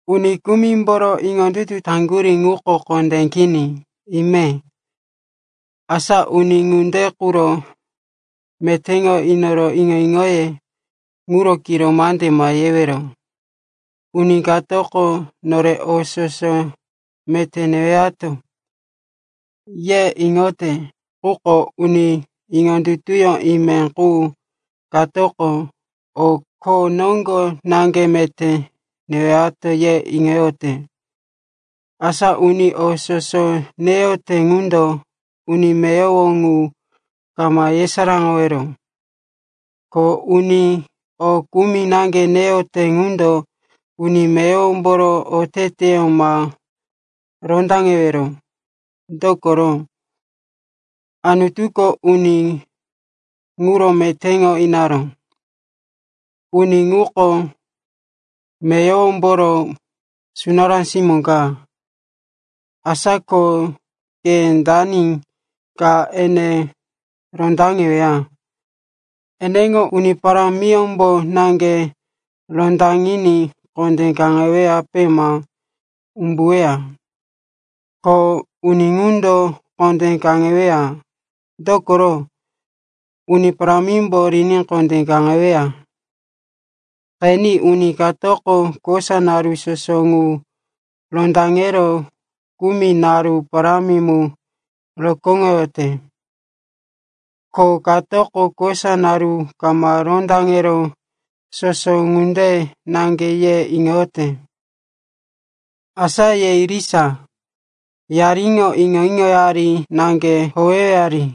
Uni kumimboro iŋondutu taŋgurí ŋuko kondé kini, ime. Asa uni ŋunde quro metéŋo inoro iŋo-iŋoye ŋuro kiro mande ma yewero. Uni katoko, nore o soso meté newato, ye iŋoyote. Quko uni iŋondutuyó ime qu katoko, o kho noŋgo naŋge meté newato, ye iŋoyote. Asa uni o soso neyote ŋundo uni meyowo ŋu ma yesaráŋowero. Ko uni o kumi naŋge neyote ŋundo uni meyowomboro oteteyó ma rondaŋewero. Dokoro, Anutuko uni ŋuro metéŋo inaró. Uni ŋuko meyowomboro sunará simó ka, asa ko ke dani ka ene rondaŋeweya? Eneŋo Uni Parámiyómbo naŋge rondaŋiní kondé kaŋeweyape ma umbuweya. Ko uni ŋundo kondé kaŋeweya, dokoro, Uni Parámimbo riní kondé kaŋeweya. Qeni, uni katoko kosa naru soso ŋu rondaŋero kumi naru parámi mu rokóŋoyote. Ko katoko kosa naru kama rondaŋero soso ŋunde naŋge ye iŋoyote. Asa ye irisa, yariŋo iŋo-iŋoyari naŋge howewari.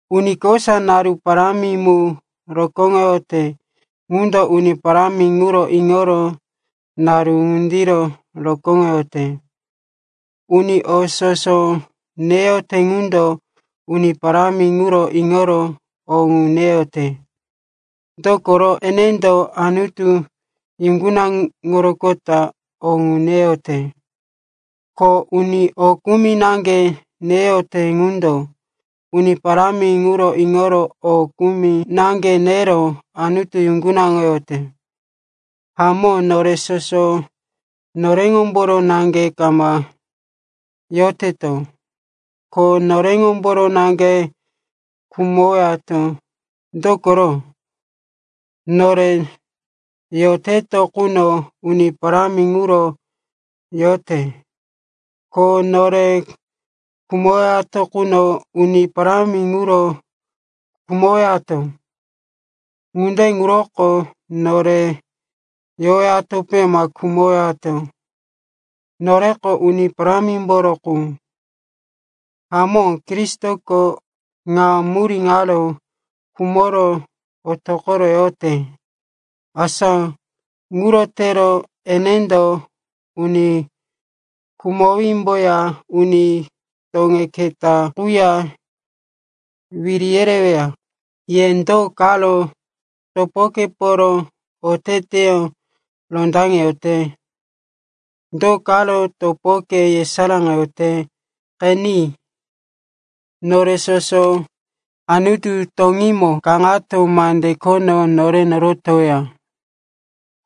Uni kosa naru parámi mu rokóŋoyote ŋundo Uni Parámi ŋuro iŋoro naru ŋundiro rokóŋoyote. Uni o soso neyote ŋundo Uni Parámi ŋuro iŋoro o ŋu neyote, dokoro enendo Anutu yuŋgunaŋoroqota o ŋu neyote. Ko uni o kumi naŋge neyote ŋundo Uni Parámi ŋuro iŋoro o kumi naŋge nero Anutu yuŋgunaŋoyote. Hamó, nore soso noreŋomboro naŋge kama yoteto, ko noreŋomboro naŋge khumowato. Dokoro, nore yoteto quno Uni Parámi ŋuro yoteto, ko nore khumowato quno Uni Parámi ŋuro khumowato. Ŋunde ŋuroko nore yowatope ma khumowato, noreko Uni Parámimboro qu. Hamó, Kristoko ŋa murí ŋaro khumoro otoqoro yote, asa ŋuro tero enendo uni khumowímboya uni toŋe keta quya wiri yereweya. Ye do karo topokeporo oteteyó rondaŋeyote? Do karo topoke yesaráŋoyote? Qeni, nore soso Anutu toŋímo kaŋato mande khono nore norotoweya.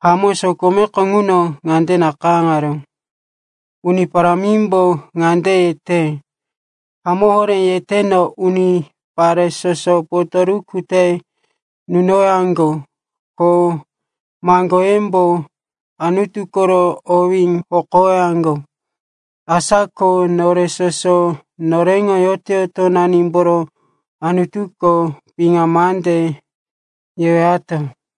Hamó, sokomeko ŋuno ŋande nakayáŋaró, “Uni Parámimbo ŋande yete, ‘Hamó horé yeteno, unipare soso potoruku te nunowaŋgo, ko maŋgoyembo Anutu koro owí hokowaŋgo.’” Asa ko nore soso noreŋo yoto-yotonanimboro Anutuko piŋa mande yewato.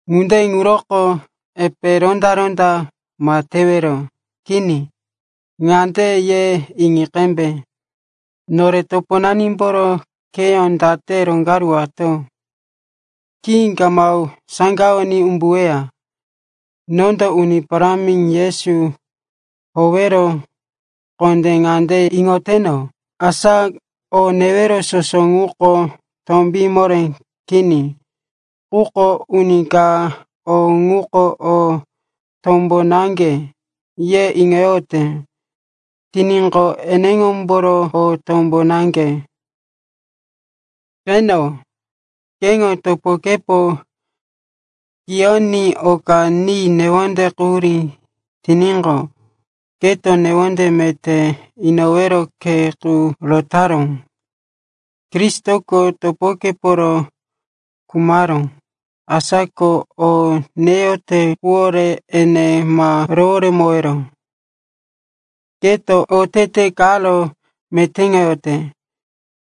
Ŋunde ŋuroko epe ronda-ronda ma tewero. Kini, ŋande ye iŋi qembe, nore toponanimboro kheyó date roŋgaruwato khí kama saŋgawoní umbuweya. Nondo Uni Parámi Yesu howero kondé ŋande iŋoteno, asa o newero soso ŋuko tombí moré kini. Quko uni ka, o ŋuko o tombo naŋge, ye iŋoyote tiníqo, eneŋomboro o tombo naŋge. Qeno, keŋo topokepo kiyoní oka ni newonde quhurí tiníqo, keto newonde meté inowero khe qu rotaró. Kristoko topokeporo khumaró. Asa ko o neyote quwore ene ma roworemowero. Keto otete karo metéŋoyote,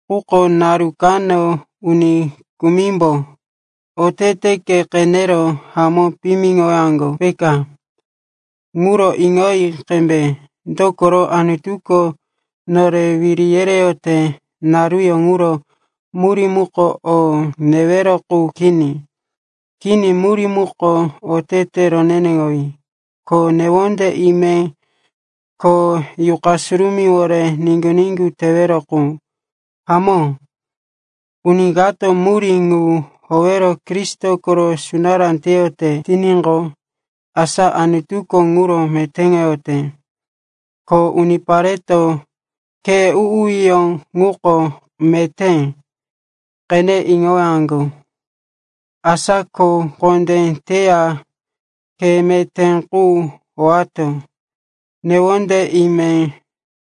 quko naru kano uni kumimbo oteteke qenero hamó piyimiŋowaŋgo, peka. Ŋuro iŋoyi qembe. Dokoro Anutuko nore wiri yereyote naruyó ŋuro murí muko o newero qu kini. Kini, murí muko otete roneneŋowí, ko newonde ime, ko Yuqa Surumíwore niŋgu-niŋgu tewero qu. Hamó, uni kato murí ŋu howero Kristo koro sunará teyote tiníqo, asa Anutuko ŋuro metéŋoyote, ko unipareto, khe u-uyó ŋuko meté, qene iŋowaŋgo. Asa ko kho kondé teya khe meté qu howato newonde ime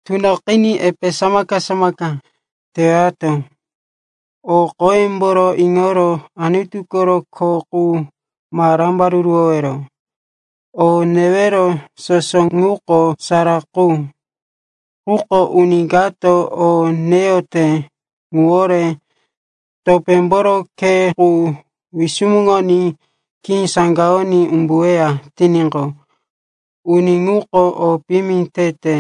tunoqiní epe samaka-samaka tewato. O qoyemboro iŋoro Anutu koro kho qu ma rambaruruwowero. O newero soso ŋuko sara qu. Quko uni kato o neyote ŋuwore topémboro khe qu wisumuŋoní khí saŋgawoní umbuweya tiníqo, uni ŋuko o piyimi tete.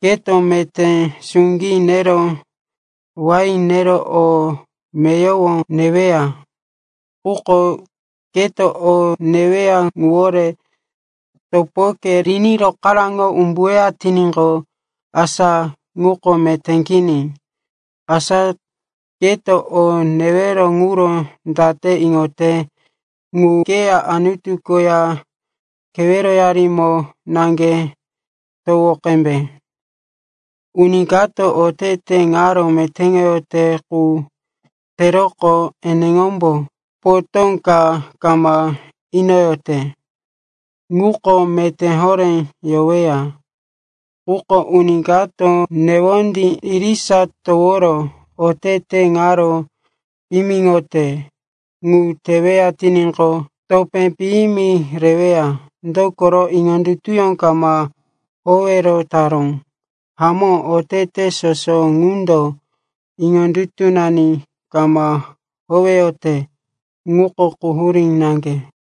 Keto meté suŋgí nero wain nero o meyowo neweya, quko keto o neweya ŋuwore topoke riní rokaráŋo umbuweya tiníqo, asa ŋuko meté kini. Asa keto o newero ŋuro date iŋote ŋu keya Anutu koya keweroyarimo naŋge towo qembe. Uni kato otete karo metéŋoyote qu teroqo eneŋombo potó ka kama inoyote ŋuko meté horé yoweya. Quko uni kato newondí irisa toworo otete karo piyimiŋote ŋu teweya tiníqo, topé piyimi reweya. Dokoro iŋondutuyó kama howero taró. Hamó, otete soso ŋundo iŋondutunani kama howeyote, ŋuko quhurí naŋge.